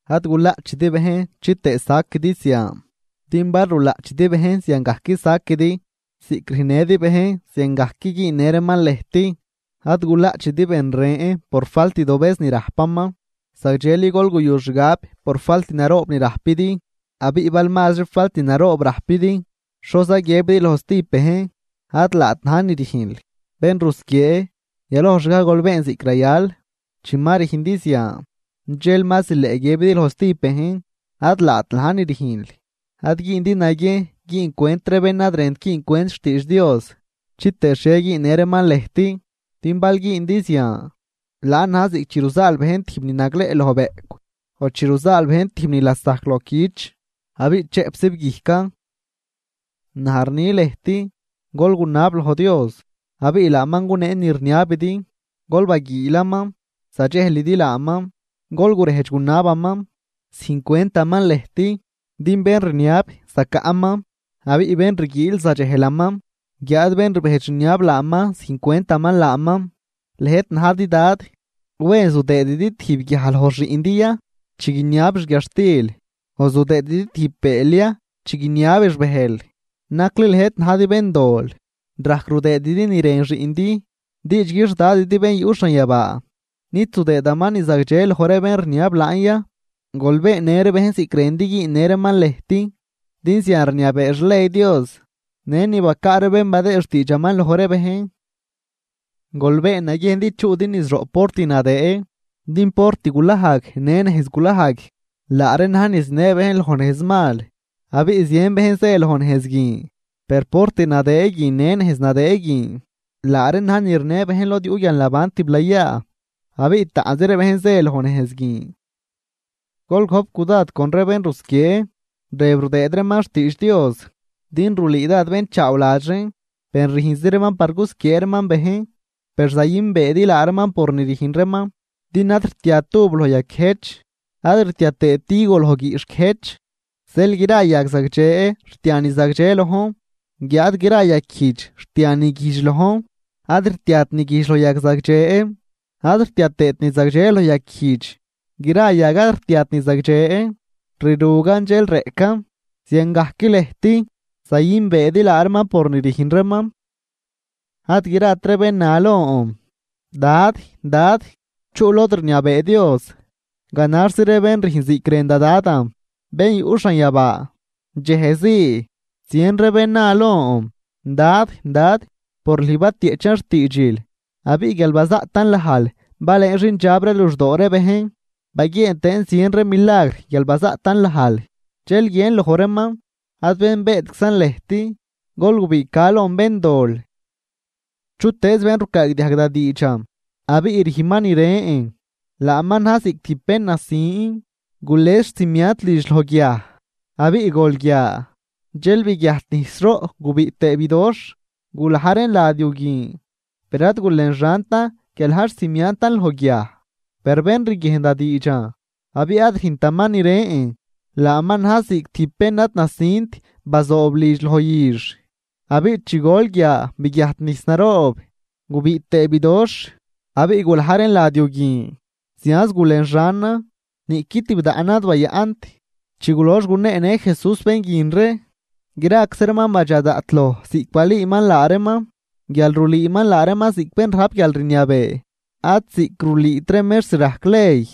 ’Ad gulaꞌchidi bejn chitëë saquidi zian. Din bal rulaꞌchidi bejn ziangajc saquidi, ziꞌc rüjnnëdi bejn ziangajc güünnë reeman lëjt. Ad gulaꞌchidi bén ren por falt dobëz ni rajpaman, zagdxeli gol guyu xgab por falt naroob ni rajpidi. Abiꞌ bal mazri falt naroob rajpidi, ¿xoza guiëbidi loj stijb bejn: “Ad laat na̱j ni rüjnl”? ¡Bén rusquiee! Yalojxgaj gol been ziꞌc rayal, chi ma rüjndi zian dxel ma zileꞌ guiëbidi loj stijb bejn: “Ad laat na̱j ni rüjnl.” ’Ad güündi naguiejn güüncwent ree bén ad rënt güüncwent xtiidx Dios, chitëë xhie güünnë reeman lëjt. Din bal güündi zian, laan na̱j ziꞌc chi ruzaal bejn tijb ni nagleꞌ loj bëꞌcw, o chi ruzaal bejn tijb ni lasajc loj cüch abiꞌ chëꞌpzib guijcan. ’Naj rni lëjt: Gol gunab loj Dios, abiꞌ laaman gunee ni rniabidi. Gol baguiilaman, zadxejlidi laaman. Gol gurejdx gunabaman, züjncwentaman lëjt. Din bén rniab, zacaꞌman. Abiꞌ bén rguiil, zadxejlaman, guiáad bén rbejdx rniab laaman, züjncwentaman laaman. ’Lëjt najdi dad, ¿wen zudëëdi tijb guiaj loj xiꞌndi ya chi guiniabix guiadxtil?, ¿o zudëëdi tijb bëël ya chi guiniabix bëjl? Nacli lëjt najdi béndol rajc rudëëdi ni rën xiꞌndi. ¡Diidxgui xDadidi bén yuꞌ xanyabaa, nid zudëëdaman ni zagdxe loj ree bén rniab laan ya! ’Gol beennë ree bejn ziꞌc rëndi güünnë reeman lëjt. Din zian rniabee xley Dios në ni bacaa ree bén badëë xtiidxaman loj ree bejn. ’Gol been naguiejn din chuꞌdi niz roꞌ port nadëë. Din port gulajg në nejz gulajg, laa reen na̱j ni zinë bejn loj nejz mal, abiꞌ zien bejn zë loj nejz guin. Per port nadëë guin në nejz nadëë guin laa reen na̱j ni rnë bejn lod yuꞌ guialnaban tiblayaa, abiꞌ taꞌnzi ree bejn zë loj nejz guin. ’Gol gojp cudad con ree bén rusquiee rëb rudëëd reeman xtiidx Dios. Din rulüü dád bén chaawladx reen, per rüjnzi reeman par gusquiee reeman bejn. Per zayünbeedi laa reeman por ni rüjn reeman, din ad rtiat uv loj yaquiëjch ad rtia tëët higo loj guiꞌxh guiëjch. Zeel gra yag zagdxe rtia ni zagdxe lojn. Guiáad gra yag guijdx rtia ni guijdx lojn. Ad rtiat ni guijdx loj yag zagdxe, ad rtia tëët ni zagdxe loj yag guijdx. Gra yag ad rtiat ni zagdxe, rirugan dxel reꞌcan. Ziangajc lëjt zayünbeedi laa reeman por ni rüjn reeman. ’Ad grat ree bén na lon: “Dad, Dad,” chuꞌ lod rniabee Dios, ganaxzi ree bén rüjn ziꞌc rën da Dadan, bén yuꞌ xanyabaa. Dxejzii, zien ree bén na lon: “Dad, Dad, por lüj batieꞌchan xtiidxil, abiꞌ guial bazaꞌtan lajl balëën xindxab ree luxdoo ree bejn, baguieen tëën zien ree milagr guial bazaꞌtan lajl.” Dxel guiën loj reeman: “Ad benbeetczan lëjt, gol gubiꞌca lon béndol.” ’Chutëëz bén rucaagdiajg da diidxan abiꞌ rüjnman ni rën, laaman na̱j ziꞌc tijb bén nasin gules xcimiant lidx loj guiaj. Abiꞌ gol guia, dxel biguiajt nijs roꞌ gubiꞌ tëë bidoxh, gulaj reen lad yu guin, per ad gulenxantan guial na̱j xcimiantan loj guiaj. Per bén riguiejn da diidxan abiꞌ ad rüjntaman ni rën, laaman na̱j ziꞌc tijb bén ad nasint bazoob lidx loj üx. Abiꞌ chi gol guia biguiajt nijs naroob, gubiꞌ tëë bidoxh. Abiꞌ gulaj reen lad yu guin zianz gulenxanan, niꞌqui tibdaꞌnan ad bayaꞌnt. Chi gulox guneenë Jesús bén guin ree, graczi reeman badxa daꞌt loj ziꞌc balüüman laa reeman, guial rulüüman laa reeman ziꞌc bén rajp guialrniabee, ad ziꞌc rulüüt ree mextr rajc ley.